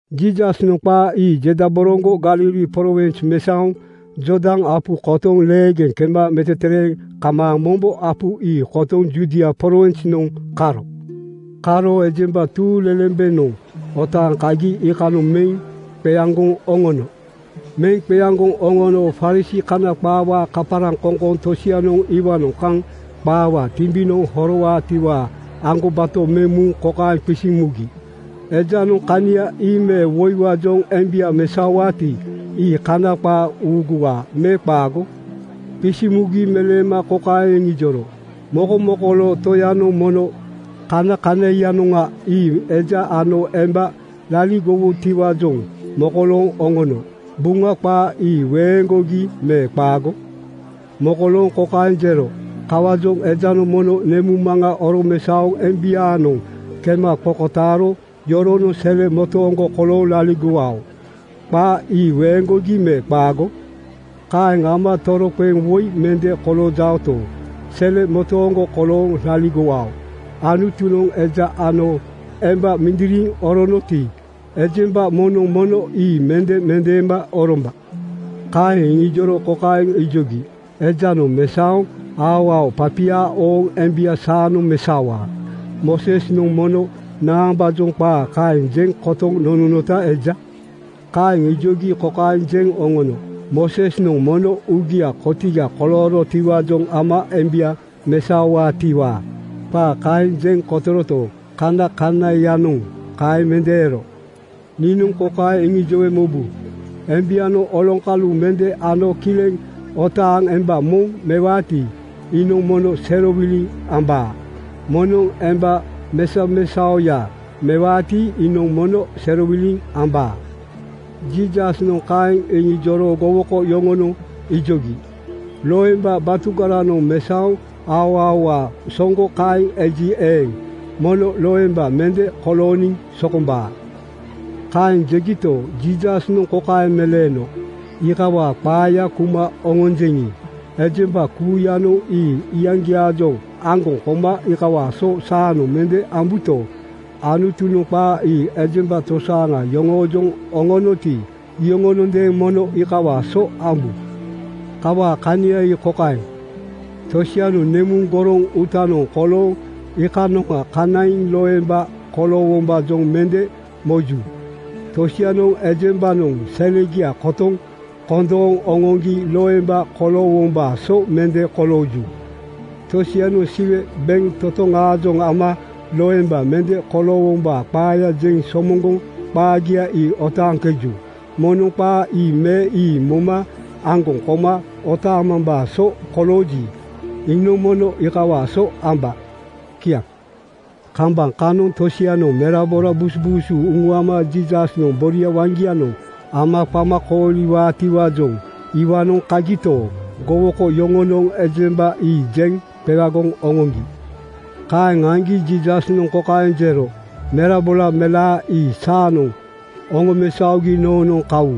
Jiisasnoŋ qaa ii jedaboroŋgo Galili prowins mesaoŋ Jordan apu kotoŋ leegeŋ kema metetereeŋ kamaaŋ mombo apu ii kotoŋ Judia prowinsnoŋ karo. Karo ejemba tuuŋlelembenoŋ otaaŋ kagi iikanoŋ meŋ qeaŋgoŋ oŋono. Meŋ qeaŋgoŋ oŋono Farisii (Kana qaawaa kaparaŋkoŋkoŋ) tosianoŋ iwaanoŋ kaŋ qaawaa timbinoŋ horowaatiwaa aŋgobato meŋ muŋ kokaeŋ qisiŋ mugi, “Ejanoŋ kania ii me woiwaajoŋ embia mesaowaati, ii Kana qaa uuguwaa me qaago?” Qisiŋ mugi meleema kokaeŋ iŋijoro, “Mokomokoloo Toyanoŋ mono kanakanaiyanoŋa ii ‘Eja ano emba laligowutiwaajoŋ mokolooŋ oŋono.’ Buŋa qaa ii weeŋgogi me qaago? Mokolooŋ kokaeŋ jero, ‘Kawaajoŋ ejanoŋ mono nemuŋmaŋa oromesaoŋ embiaanoŋ kema qokotaaro yoronoŋ sele motooŋgo kolooŋ laligowao.’ Qaa ii weeŋgogi me qaago? Kaeŋ ama toroqeŋ woi mende koloojaoto, sele motooŋgo kolooŋ laligowao. Anutunoŋ eja ano emba mindiriŋ oronoti, ejemba moŋnoŋ mono ii mende mendeema oromba.” Kaeŋ iŋijoro kokaeŋ ijogi, “Ejanoŋ mesaoŋ aoao papia ooŋ embia saanoŋ mesaowaa. Moosesnoŋ mono naambaajoŋ qaa kaeŋ jeŋ kotoŋ nononota eja?” Kaeŋ ijogi kokaeŋ jeŋ oŋono, “Moosesnoŋ mono uugia kotiga koloorotiwaajoŋ ama embia mesaowaatiwaa qaa kaeŋ jeŋ kotoroto, kanakanaiyanoŋ kaeŋ mende ero. Niinoŋ kokaeŋ iŋijowe mobu: Embianoŋ oloŋkalu mende ano kileŋ otaaŋ emba moŋ mewaati, iinoŋ mono serowiliŋ ambaa. Moŋnoŋ emba mesamesaoya mewaati, iinoŋ mono serowiliŋ ambaa.” Jiisasnoŋ kaeŋ iŋijoro gowoko yoŋonoŋ ijogi, “Loemba batugaranoŋ mesaoŋ aoaoawaa soŋgo kaeŋ eji eeŋ, mono loemba mende kolooniŋ sokombaa.” Kaeŋ jegito, Jiisasnoŋ kokaeŋ meleeno, “Iikawaa qaaya kuma oŋonjeŋi, ejemba kuuyanoŋ ii iyaŋgiaajoŋ aŋgoŋ koma iikawaa so saanoŋ mende ambuto, Anutunoŋ qaa ii ejemba tosaaŋa yoŋoojoŋ oŋonoti, iyoŋonondeeŋ mono iikawaa so ambu. Kawaa kania ii kokaeŋ: Tosianoŋ nemuŋ goroŋ uutanoŋ kolooŋ iikanoŋa kanaiŋ loemba koloowombaajoŋ mende moju. Tosianoŋ ejembanoŋ selegia kotoŋ kondooŋ oŋoŋgi loemba koloowombaa so mende kolooju. Tosianoŋ Siwe bentotoŋaajoŋ ama loemba mende koloowombaa qaaya jeŋ somoŋgoŋ qaagia ii otaaŋkeju. Moŋnoŋ qaa ii me ii moma aŋgoŋ koma otaamambaa so kolooji, iinoŋ mono iikawaa so amba.” Kiaŋ. Kambaŋ kanoŋ tosianoŋ merabora busubuusu uŋuama Jiisasnoŋ boria waŋgianoŋ ama qama kooliwaatiwaajoŋ iwaanoŋ kagito, gowoko yoŋonoŋ ejemba ii jeŋ qewagoŋ oŋoŋgi. Kaeŋ aŋgi Jiisasnoŋ kokaeŋ jero, “Merabora melaa ii saanoŋ oŋomesaogi noonoŋ kawu.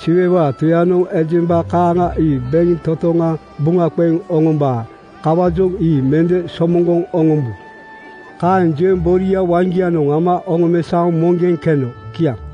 Siwewaa Toyanoŋ ejemba kaaŋa ii bentotoŋa buŋa qeŋ oŋombaa. Kawaajoŋ ii mende somoŋgoŋ oŋombu.” Kaeŋ jeŋ boria waŋgianoŋ ama oŋomesaoŋ moŋgeŋ keno. Kiaŋ.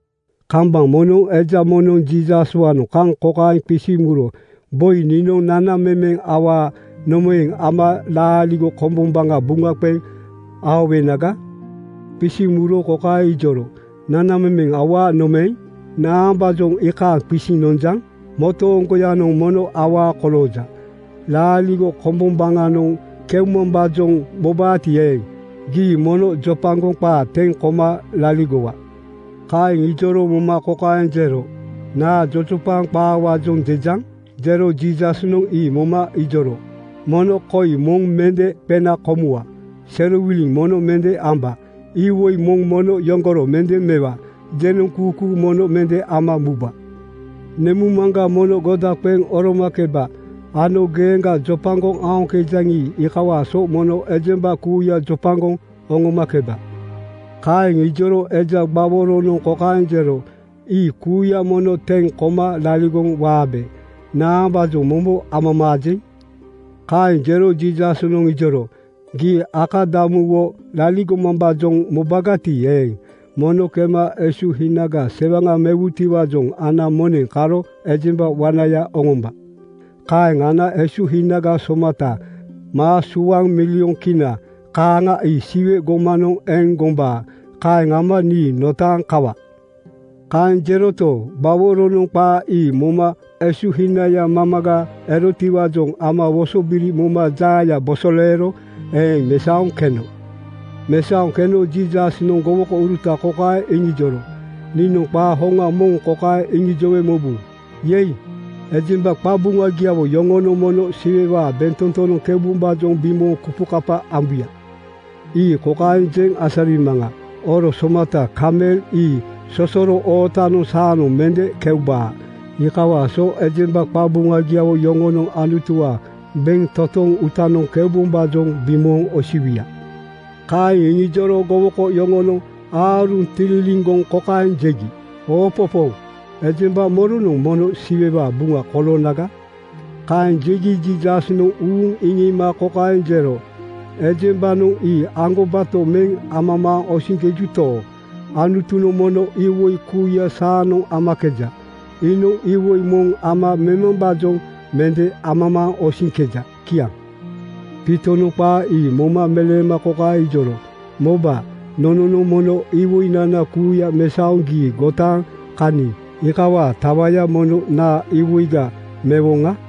Kambaŋ moŋnoŋ eja moŋnoŋ Jiisaswaanoŋ kaŋ kokaeŋ qisiŋ muro, “Boi, niinoŋ nanamemeŋ awaa nomaeŋ ama laaligo kombombaŋa buŋa qeŋ aowenaga?” Qisiŋ muro kokaeŋ ijoro, “Nanamemeŋ awaa nomaeŋ, naambaajoŋ iikaeŋ qisiŋ nonjaŋ? Motooŋgoyanoŋ mono awaa kolooja. Laaligo kombombaŋanoŋ keumambaajoŋ mobaati eeŋ, gii mono jojopaŋ qaa teŋ koma laligowa.” Kaeŋ ijoro moma kokaeŋ jero, “Naa jojopaŋ qaawaajoŋ jejaŋ?” Jero Jiisasnoŋ ii moma ijoro, “Mono koi: ‘Moŋ mende qena komuwa. Serowiliŋ mono mende amba. Iwoi moŋ mono yoŋgoro mende mewa. Jenoŋkuukuu mono mende ama muba. Nemuŋmaŋga mono goda qeŋ oromakeba,’ ano ‘Geeŋga jopagoŋ aoŋkejaŋi, iikawaa so mono ejemba kuuya jopagoŋ oŋomakeba.” ’ Kaeŋ ijoro eja gbaworonoŋ kokaeŋ jero, “Ii kuuya mono teŋ koma laligoŋ waabe. Naambaajoŋ mombo amamaajeŋ?” Kaeŋ jero Jiisasnoŋ ijoro, “Gii akadamuwo laligomambaajoŋ mobagati eeŋ, mono kema esuhinaga sewaŋa mewutiwaajoŋ ana moneŋ karo ejemba wanaya oŋomba. Kaeŋ ana esuhinaga somata (maa suaŋ, milyon Kina kaaŋa) ii Siwe gomanoŋ eŋ gombaa. Kaeŋ ama nii notaaŋ kawa.” Kaeŋ jeroto, gbaworonoŋ qaa ii moma esuhinaya mamaga erotiwaajoŋ ama wosobiri moma jaaya bosoleero eeŋ mesaoŋ keno. Mesaoŋ keno Jiisasnoŋ gowokouruta kokaeŋ iŋijoro, “Niinoŋ qaa hoŋa moŋ kokaeŋ iŋijowe mobu: ‘Yei!’ Ejemba qabuŋagiawo yoŋonoŋ mono Siwewaa bentotonoŋ keubombaajoŋ bimooŋ kupukapa ambuya. Ii kokaeŋ jeŋ asarimaŋa: oro somata kamel ii sosoro ootanoŋ saanoŋ mende keubaa. Iikawaa so ejemba qabuŋagiawo yoŋonoŋ Anutuwaa bentotoŋ uutanoŋ keubombaajoŋ bimooŋ osiwuya.” Kaeŋ iŋijoro gowoko yoŋonoŋ aaruŋ tililiŋgoŋ kokaeŋ jegi, “Oopopooŋ! Ejemba moronoŋ mono Siwewaa buŋa koloonaga?” Kaeŋ jegi Jiisasnoŋ uuŋ iŋiima kokaeŋ jero, “Ejembanoŋ ii aŋgobato meŋ amamaaŋ osiŋkejuto, Anutunoŋ mono iwoi kuuya saanoŋ amakeja. Iinoŋ iwoi moŋ ama memambaajoŋ mende amamaaŋ osiŋkeja.” Kiaŋ. Piitonoŋ qaa ii moma meleema kokaeŋ ijoro, “Moba, nononoŋ mono iwoinana kuuya mesaoŋ gii gotaaŋ kaniŋ. Iikawaa tawaya mono naa iwoiga mewoŋa?”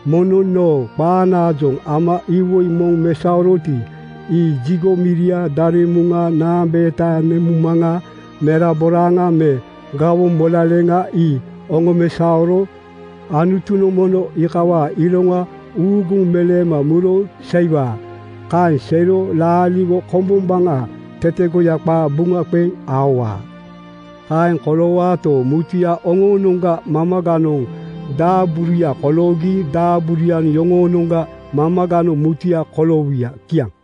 “Moŋnoŋ noo qanaajoŋ ama iwoi moŋ mesaoroti, ii jigo miria, daremuŋa, naambeeta, nemuŋmaŋa, meraboraaŋa me gawoŋ molaleŋa ii oŋomesaoro Anutunoŋ mono iikawaa iroŋa uuguŋ meleema muro seiwaa. Kaeŋ seiro laaligo kombombaŋa tetegoya qaa buŋa qeŋ aowaa. Kaeŋ koloowaato, mutuya oŋoonoŋga mamaganoŋ daaburuya koloogi daaburuya yoŋoonoŋga mamaganoŋ mutuya koloowuya.” Kiaŋ.